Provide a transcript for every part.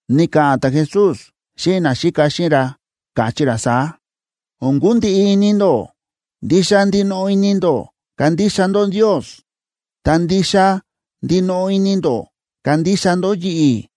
Ni̱ka̱ꞌa̱n ta̱Jesús xíꞌin naxíka xíꞌin ra, káchí ra saá: ―O̱n kundiꞌi ini ndó. Ndixa ndinoꞌo ini ndó kandixa ndó Ndios, ta ndixa ndinoꞌo ini ndó kandixa ndó yi̱ꞌi̱.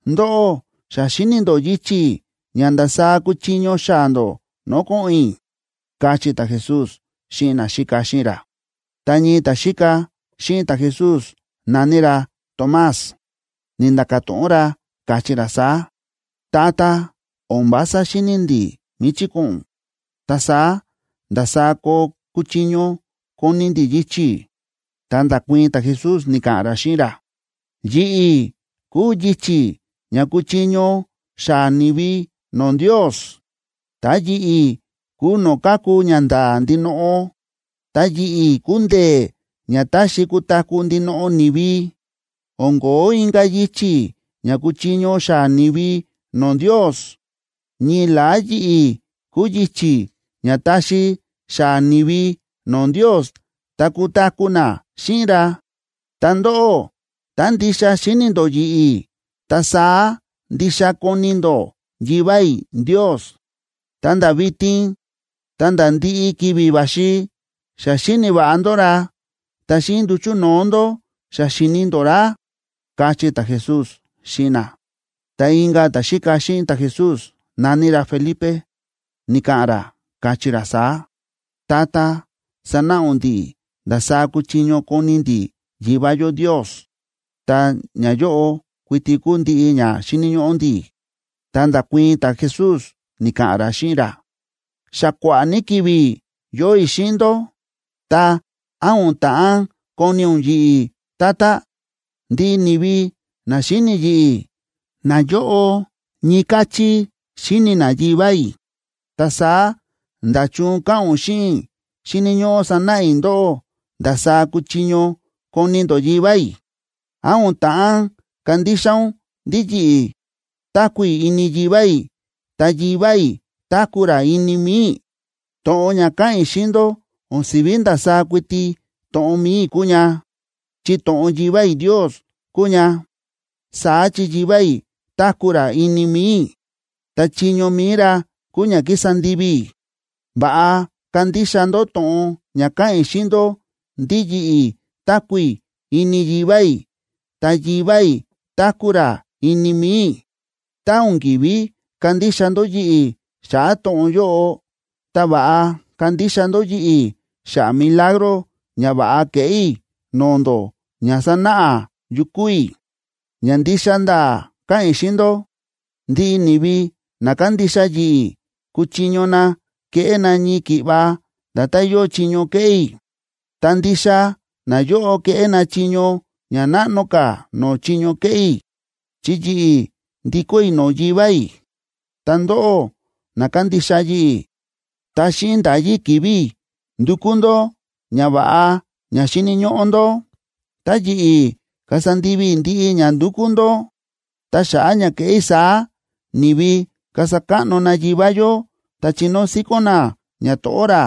Ndóꞌó, xa xíni̱ ndó yichi̱ ña ndasaá kuchiño xaa̱ ndó no̱o̱ ko̱ꞌo̱n i̱ ―káchí ta̱Jesús xíꞌin naxíka xíꞌin ra. Ta ñii ta̱xíka xíꞌin ta̱Jesús, na̱ní ra Tomás, ni̱nda̱ka̱ to̱ꞌon ra, káchí ra saá: ―Tata, o̱n vása xíni̱ ndi̱ míchí ko̱ꞌo̱n ún, ta saá, ¿ndasaá koo kuchiño koni̱ ndi̱ yichi̱? Ta nda̱kuii̱n ta̱Jesús, ni̱ka̱ꞌa̱n ra xíꞌin ra: ―Yi̱ꞌi̱ kúu yichi̱ ña kuchiño xaa̱ ni̱vi no̱o̱ Ndios, ta yi̱ꞌi̱ kúu no̱o̱ káku ñanda̱a̱ ndinoꞌo, ta yi̱ꞌi̱ kúu ndee̱ ña taxi kutaku̱ ndinoꞌo ni̱vi. O̱n ko̱ó inka̱ yichi̱ ña kuchiño xaa̱ ni̱vi no̱o̱ Ndios: ñii la̱á yi̱ꞌi̱ kúu yichi̱ ña taxi xaa̱ ni̱vi no̱o̱ Ndios ta kutaku̱ na xíꞌin ra. Ta ndóꞌó, tá ndixa xíni̱ ndó yi̱ꞌi̱, ta saá ndixa koni̱ ndó Yivá i̱ Ndios. Ta nda̱ vitin ta̱nda̱ ndiꞌi ki̱vi̱ va̱xi, xa xíni̱ va̱ꞌa ndó ra, ta xíꞌin nduchu̱ no̱o̱ ndó xa xi̱ni ndó ra ―káchí ta̱Jesús xíꞌin na. Ta inka̱ ta̱xíka xíꞌin ta̱Jesús, na̱ní ra Felipe, ni̱ka̱ꞌa̱n ra, káchí ra saá: ―Tata, sanáꞌa ún ndi̱ꞌi̱ ndasaá kuchiño koni ndi̱ Yivá yó Ndios, ta ñayóꞌo kuiti kúu ndiꞌi ña xíni̱ ñóꞌó ndi̱. Ta nda̱kuii̱n ta̱Jesús, ni̱ka̱ꞌa̱n ra xíꞌin ra: ―Xa kua̱ꞌa̱ ní ki̱vi̱ yóo i̱ xíꞌin ndó, ta, ¿án o̱n ta̱ꞌán koni̱ ún yi̱ꞌi̱, tata? Ndiꞌi ni̱vi na xíni yi̱ꞌi̱, nayóꞌo ñii káchí xíni na Yivá i̱. Ta saá, ¿nda̱chun káꞌa̱n ún xíꞌin i̱ xíni̱ ñóꞌó sanáꞌa i̱ ndóꞌó ndasaá kuchiño koni ndó Yivá i̱? ¿Án o̱n ta̱ꞌán kandixa ún ndí yi̱ꞌi̱ táku̱ i̱ ini Yivá i̱ ta Yivá i̱ táku̱ ra ini mi̱i i̱? To̱ꞌon ña káꞌa̱n i̱ xíꞌin ndó, o̱n si̱ví ndasaá kuiti to̱ꞌon mi̱i i̱ kúu ña, chi to̱ꞌon Yivá i̱ Ndios kúu ña. Saá chi Yivá i̱ táku̱ ra ini mi̱i i̱, ta chiño mi̱i ra kúu ña kísa ndivi i̱. Va̱ꞌa kandixa ndó to̱ꞌon ña káꞌa̱n i̱ xíꞌin ndó ndí yi̱ꞌi̱ táku̱ i̱ ini Yivá i̱ ta Yivá i̱ táku̱ ra ini mi̱i i̱. Tá o̱n ki̱ví kandixa ndó yi̱ꞌi̱ xa̱ꞌa̱ to̱ꞌon yóꞌo, ta va̱ꞌa kandixa ndó yi̱ꞌi̱ xa̱ꞌa̱ milagro ñava̱ꞌa ke̱ꞌé i̱ no̱o̱ ndó ña sánáꞌa yu kúu i̱. Ña ndixa nda̱a̱ káꞌa̱n i̱ xíꞌin ndó, ndiꞌi ni̱vi na kándixa yi̱ꞌi̱ kúchiño na keꞌé na ñii ki̱ꞌva nda̱tán yóo chiño kéꞌé i̱. Ta ndixa nayóꞌo keꞌé na chiño ña náꞌno ka̱ no̱o̱ chiño ke̱ꞌé i̱, chi yi̱ꞌi̱ ndikó i̱ no̱o̱ Yivá i̱. Tá ndóꞌó na kándixa yi̱ꞌi̱, tá xíꞌin nda̱yí ki̱vi̱ i̱, ndukú ndó ñava̱ꞌa ña xíni̱ ñóꞌó ndó, ta yi̱ꞌi̱ kasa ndivi i̱ ndiꞌi ña ndukú ndó. Ta xa̱ꞌa̱ ña keꞌé i̱ saá, ni̱vi kasa káꞌno na Yivá yó ta chinóo síkón na ñato̱ꞌó ra.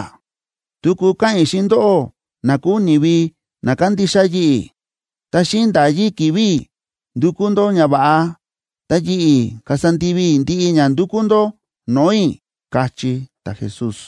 Tuku káꞌa̱n i̱ xíꞌin ndóꞌó na kúu ni̱vi na kándixa yi̱ꞌi̱: Tá xíꞌin nda̱yí ki̱vi̱ i̱ ndúkú ndó ñava̱ꞌa, ta yi̱ꞌi̱ kasa ndivi i̱ ndiꞌi ña ndúkú ndó no̱o̱ i̱ ―káchí ta̱Jesús.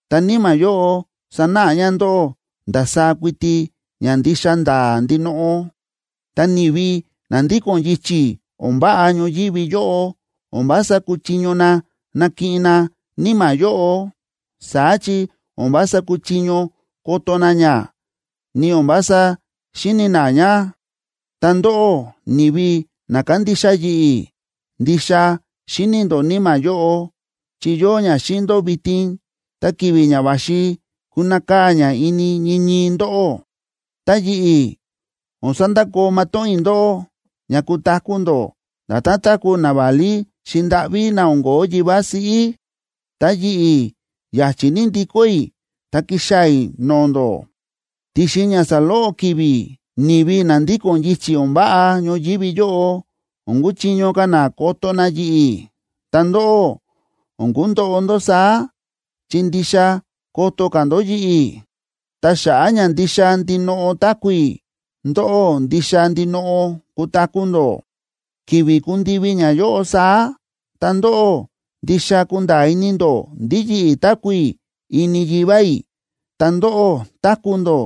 Ta Níma̱ yóꞌo sanáꞌa ña ndóꞌó ndasaá kuiti ña ndixa nda̱a̱ ndinoꞌo. Ta ni̱vi na ndíko̱n yichi̱ o̱n váꞌa ñoyívi yóꞌo o̱n vása kúchiño na nakiꞌin na Níma̱ yóꞌo, saá chi o̱n vása kúchiño koto na ña, ni o̱n vása xíni̱ na ña. Ta ndóꞌó, ni̱vi na kándixa yi̱ꞌi̱, ndixa xíni̱ ndó Níma̱ yóꞌo, chi yóo ña xíꞌin ndó vitin, ta ki̱vi̱ ña va̱xi kunakaa̱ ña ini ñii ñii ndóꞌó. Ta yi̱ꞌi̱, o̱n sandakoo matóꞌón i̱ ndóꞌó, ña kutaku̱ ndó nda̱tán táku̱ naválí xi̱ndáꞌví na o̱n ko̱ó yivá siꞌí. Ta yi̱ꞌi̱ ya̱chi̱ ní ndikó i̱ ta kixaa̱ i̱ no̱o̱ ndó. Ti̱xin ña saloꞌo ki̱vi̱, ni̱vi na ndíko̱n yichi̱ o̱n váꞌa ñoyívi yóꞌo, o̱n kuchiño ka̱ na koto na yi̱ꞌi̱. Ta ndóꞌó, o̱n kundoꞌo ndó saá, chi ndixa koto ka̱ ndó yi̱ꞌi̱. Ta xa̱ꞌa̱ ña ndixa ndinoꞌo táku̱ i̱, ndóꞌó ndixa ndinoꞌo kutaku̱ ndó. Ki̱vi̱ kundivi ñayóꞌo saá, ta ndóꞌó ndixa kunda̱a̱ ini ndó ndí yi̱ꞌi̱ táku̱ i̱ ini Yivá i̱, ta ndóꞌó táku̱ ndó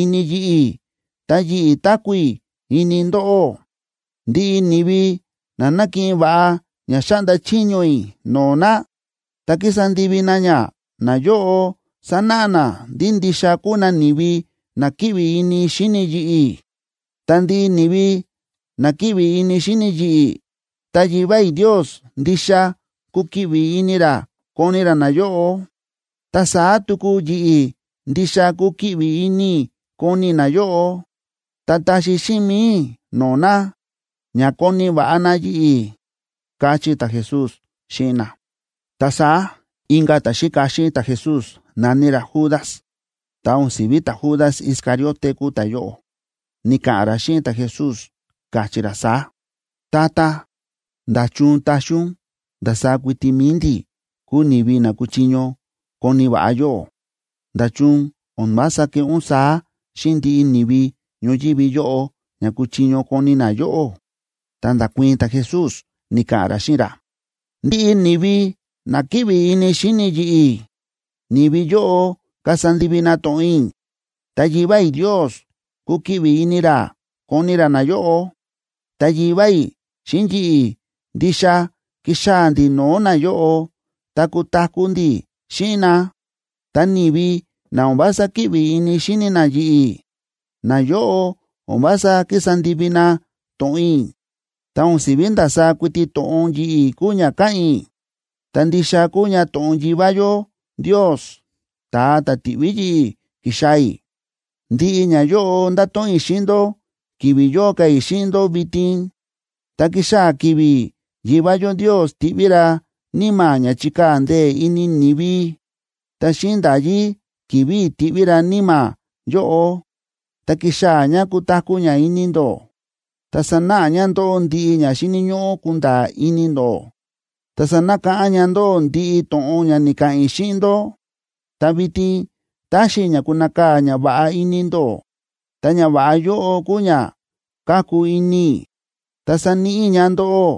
ini yi̱ꞌi̱, ta yi̱ꞌi̱ táku̱ i̱ ini ndóꞌó. Ndiꞌi ni̱vi na nákiꞌin va̱ꞌa ña xáꞌnda chiño i̱ no̱o̱ na, ta kísa ndivi na ña, nayóꞌo sánáꞌa na ndí ndixa kúu na ni̱vi na kíꞌvi ini xíni yi̱ꞌi̱. Ta ndiꞌi ni̱vi na kíꞌvi ini xíni yi̱ꞌi̱, ta Yivá i̱ Ndios ndixa kukiꞌvi ini ra koni ra nayóꞌo. Ta saá tuku yi̱ꞌi̱ ndixa kukiꞌvi ini i̱ koni i̱ nayóꞌo ta taxi xíꞌin mi̱i i̱ no̱o̱ na, ña koni̱ va̱ꞌa na yi̱ꞌi̱ ―káchí ta̱Jesús xíꞌin na. Ta saá inka̱ ta̱xíka xíꞌin ta̱Jesús, na̱ní ra Judas (ta o̱n si̱ví ta̱Judas Iscariote kúu ta̱yóꞌo), ni̱ka̱ꞌa̱n ra xíꞌin ta̱Jesús, káchí ra saá: ―Tata, ¿nda̱chun taxi ún ndasaá kuiti mi̱i ndi̱ kuu ni̱vi na kuchiño koni̱ va̱ꞌa yóꞌó? ¿Nda̱chun o̱n vása keꞌé ún saá xíꞌin ndiꞌi ni̱vi ñoyívi yóꞌo ña kuchiño koni̱ na yóꞌó? Ta nda̱kuii̱n ta̱Jesús, ni̱ka̱ꞌa̱n ra xíꞌin ra: ―Ndiꞌi ni̱vi na kíꞌvi ini xíni yi̱ꞌi̱, ni̱vi yóꞌo kasa ndivi na to̱ꞌon i̱. Ta Yivá i̱ Ndios kukiꞌvi ini ra koni ra nayóꞌo, ta Yivá i̱ xíꞌin yi̱ꞌi̱ ndixa kixaa̱ ndi̱ no̱o̱ nayóꞌo, ta kutaku̱ ndi̱ xíꞌin na. Ta ni̱vi na o̱n vása kíꞌvi ini xíni na yi̱ꞌi̱, nayóꞌo o̱n vása kísa ndivi na to̱ꞌon i̱. Ta o̱n si̱ví ndasaá kuiti to̱ꞌon yi̱ꞌi̱ kúu ña káꞌa̱n i̱, ta ndixa kúu ña to̱ꞌon Yivá yó Ndios, ta̱a ta̱ ti̱ꞌví yi̱ꞌi̱ ki̱xaa̱ i̱. ’Ndiꞌi ñayóꞌo ndáto̱ꞌon i̱ xíꞌin ndó ki̱vi̱ yóo ka̱ i̱ xíꞌin ndó vitin. Ta kixaa̱ ki̱vi̱ Yivá yó Ndios tiꞌví ra Níma̱ ña chíkaa̱ ndee̱ ini ni̱vi, ta xíꞌin nda̱yí ki̱vi̱ i̱ tiꞌví ra Níma̱ yóꞌo, ta kixaa̱ ña kutaku̱ ña ini ndó, ta sanáꞌa ña ndóꞌó ndiꞌi ña xíni̱ ñóꞌó kunda̱a̱ ini ndó, ta sanakáꞌán ña ndóꞌó ndiꞌi to̱ꞌon ña ni̱ka̱ꞌa̱n i̱ xíꞌin ndó. ’Ta vitin táxi i̱ ña kunakaa̱ ñava̱ꞌa ini ndó. Ta ñava̱ꞌa yóꞌo kúu ña káku ini i̱, ta sáníꞌi i̱ ña ndóꞌó.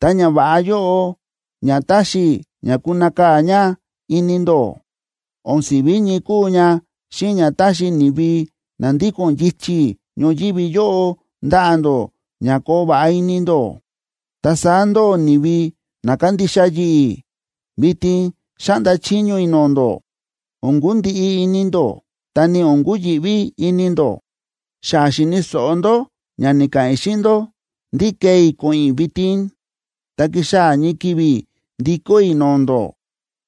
Ta ñava̱ꞌa yóꞌo ña táxi i̱ ña kunakaa̱ ña ini ndó, o̱n si̱ví ñii kúu ña xíꞌin ña táxi ni̱vi na ndíko̱n yichi̱ ñoyívi yóꞌo ndaꞌa̱ ndó ña koo va̱ꞌa ini ndó. Ta saá ndóꞌó ni̱vi na kándixa yi̱ꞌi̱, vitin xáꞌnda chiño i̱ no̱o̱ ndó: O̱n kundiꞌi ini ndó, ta ni o̱n kuyi̱ꞌví ini ndó. Xa xi̱ni̱ so̱ꞌo ndó ña ni̱ka̱ꞌa̱n i̱ xíꞌin ndó ndí kee i̱ ko̱ꞌo̱n i̱ vitin, ta kixaa̱ ñii ki̱vi̱ ndikó i̱ no̱o̱ ndó.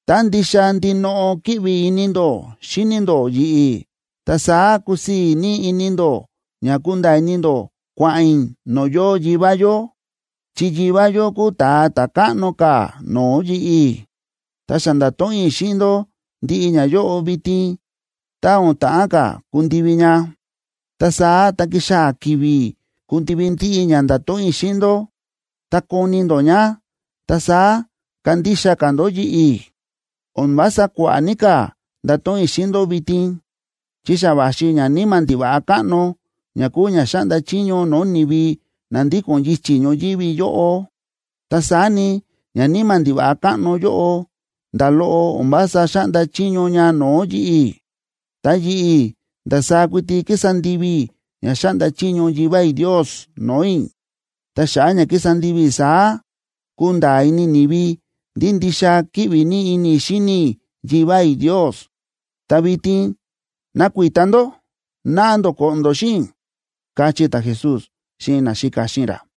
Tá ndixa ndinoꞌo kíꞌvi ini ndó xíni ndó yi̱ꞌi̱, ta saá kusii̱ ní ini ndó ña kunda̱a̱ ini ndó kua̱ꞌa̱n i̱ no̱o̱ yóo Yivá yó, chi Yivá yó kúu ta̱a ta̱ káꞌno ka̱ no̱o̱ yi̱ꞌi̱. Ta xa nda̱to̱ꞌon i̱ xíꞌin ndó ndiꞌi ñayóꞌo vitin tá o̱n ta̱ꞌán ka̱ kundivi ña. Ta saá tá kixaa̱ ki̱vi̱ kundivi ndiꞌi ña nda̱to̱ꞌon i̱ xíꞌin ndó, ta koni ndó ña, ta saá kandixa ka̱ ndó yi̱ꞌi̱. ’O̱n vása kua̱ꞌa̱ ní ka̱ ndato̱ꞌon i̱ xíꞌin ndó vitin, chi xa va̱xi ñaníma̱ ndiva̱ꞌa káꞌno ña kúu ña xáꞌnda chiño no̱o̱ ni̱vi na ndíko̱n yichi̱ ñoyívi yóꞌo. Ta saá ni, ñaníma̱ ndiva̱ꞌa káꞌno yóꞌo nda̱ loꞌo o̱n vása xáꞌnda chiño ña no̱o̱ yi̱ꞌi̱. Ta yi̱ꞌi̱, ndasaá kuiti kísa ndivi i̱ ña xáꞌnda chiño Yivá i̱ Ndios no̱o̱ i̱. Ta xa̱ꞌa̱ ña kísa ndivi i̱ saá, kunda̱a̱ ini ni̱vi ndí ndixa kíꞌvi ní ini i̱ xíni i̱ Yivá i̱ Ndios. Ta vitin, nakuita ndó, naꞌa ndó ko̱ꞌo̱n ndó xíꞌin i̱ ―káchí ta̱Jesús xíꞌin naxíka xíꞌin ra.